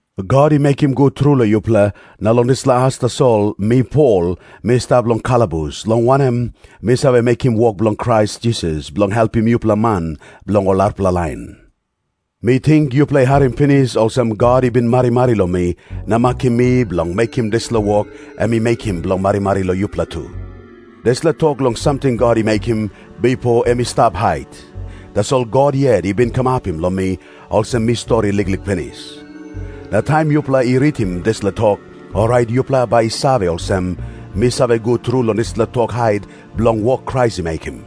God i mekim gut tru long yupela, na long dispela as tasol mi Pol mi stap long kalabus, long wanem, mi save mekim wok bilong Krais Jisas bilong helpim yupela man bilong ol arapela lain. Mi ting yupela i harim pinis olsem, God i bin marimari long mi na makim mi bilong mekim dispela wok em i mekim bilong marimari long yupela tu. Dispela tok long samting God i mekim, bipo em i stap hait, tasol God yet i bin kamapim long mi, olsem mi stori liklik pinis. Na taim yupela i ritim dispela tok, orait yupela bai i save olsem, mi save gut tru long dispela tok hait bilong wok Krais i mekim.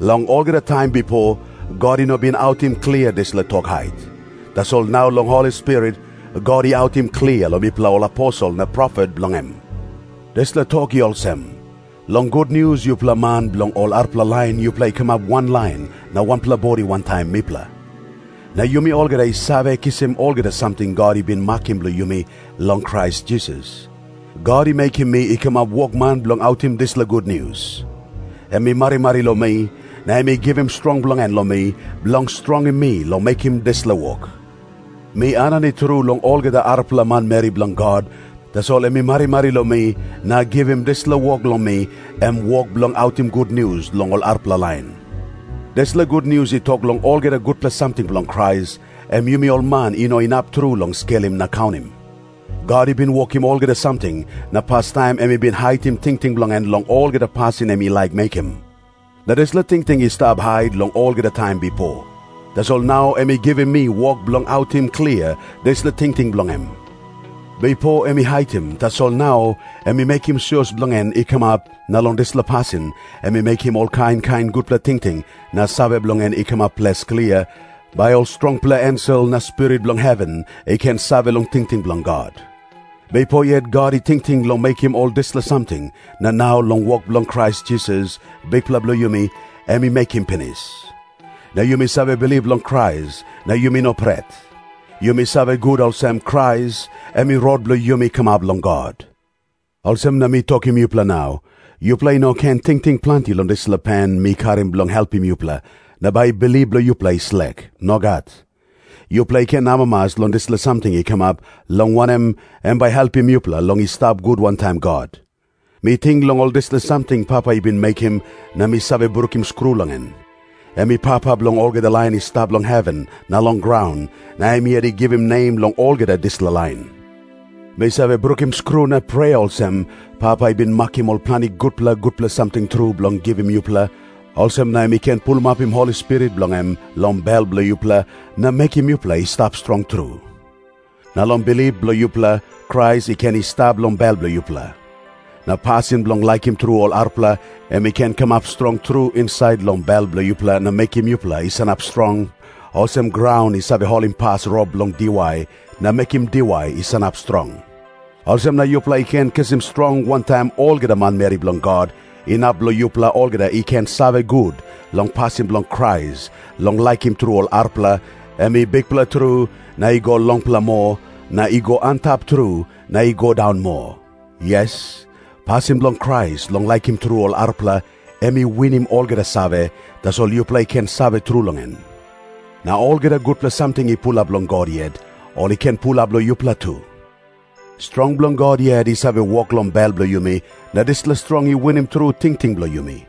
Long olgeta taim bipo, God i no bin autim klia dispela tok hait. Tasol nau long Holi Spirit, God i autim klia long mipela ol aposel na profet bilong em. Dispela tok i olsem. Long gutnius yupela man bilong ol arapela lain yupela i kamap wanlain na wanpela bodi wantaim mipela. Na yumi olgeta i save kisim olgeta samting God i bin makim bilong yumi long Krais Jisas. God i mekim mi i kamap wokman bilong autim dispela gutnius. Em i marimari long mi, na em i givim strong bilong en long mi, bilong strongim mi long mekim dispela wok. Mi aninit tru long olgeta arapela manmeri bilong God, tasol em i marimari long mi na givim dispela wok long mi, em wok bilong autim gutnius long ol arapela lain. Dispela gutnius i tok long olgeta gutpela samting bilong Krais, em yumi ol man i no inap tru long skelim na kaunim. God i bin wokim olgeta samting, na pastaim em i haitim tingting bilong en long olgeta pasin em i laik mekim. Na dispela tingting i stap hait long olgeta taim bipo. Tasol nau em i givim mi wok bilong autim klia dispela tingting bilong em. Bipo em i haitim, tasol nau em i mekim sios bilong en i kamap, na long dispela pasin em i mekim ol kain kain gutpela tingting na save bilong en i kamap ples klia, bai ol strongpela ensel na spirit bilong heven i ken save long tingting bilong God. Bipo yet God i tingting long mekim ol dispela samting, na nau long wok bilong Krais Jisas, Bikpela bilong yumi, em i mekim pinis. Na yumi save bilip long Krais, na yumi no pret. Yumi save gut olsem, Krais em i rot bilong yumi kamap long God. Olsem na mi tokim yupela nau, yupela i no ken tingting planti long dispela pen mi karim bilong helpim yupela, na bai bilip bilong yupela i slek. Nogat. Yupela i ken amamas long dispela samting i kamap, long wanem, em bai i helpim yupela long i stap gut wantaim God. Mi ting long ol dispela samting Papa i bin mekim na mi save brukim skru long en. Em i Papa bilong olgeta lain i stap long heven na long graun, na em yet i givim nem long olgeta dispela lain. Mi save brukim skru na prea olsem, Papa i bin makim ol planti gutpela gutpela samting tru bilong givim yupela, olsem na em i ken pulapim Holi Spirit bilong em long bel bilong yupela, na mekim yupela i stap strong tru. Na long bilip bilong yupela, Krais i ken i stap long bel bilong yupela. Na pasin bilong laikim tru ol arapela, em i ken kamap strong tru insait long bel bilong yupela na mekim yupela i sanap strong, olsem graun i save holimpas rop bilong diwai na mekim diwai i sanap strong. Olsem na yupela i ken kisim strong wantaim olgeta manmeri bilong God, inap long yupela olgeta i ken save gut long pasin bilong Krais long laikim tru ol arapela, em i bikpela tru, na i go longpela moa, na i go antap tru, na i go daun moa. Yes, pasin bilong Krais long laikim tru ol arapela, em i winim olgeta save, tasol yupela i ken save tru long en. Na olgeta gutpela samting i pulap long God yet, ol i ken pulap long yupela tu. Strong bilong God yet i save wok long bel bilong yumi, na dispela strong i winim tru tingting bilong yumi.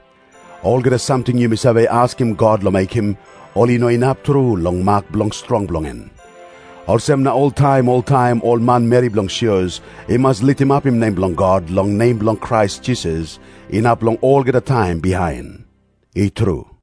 Olgeta samting yumi save askim God long mekim, ol i no inap tru long mak bilong strong bilong en. Olsem na oltaim oltaim ol manmeri bilong sios i mas litimapim nem bilong God long nem bilong Krais Jisas, inap long olgeta taim bihain. I tru.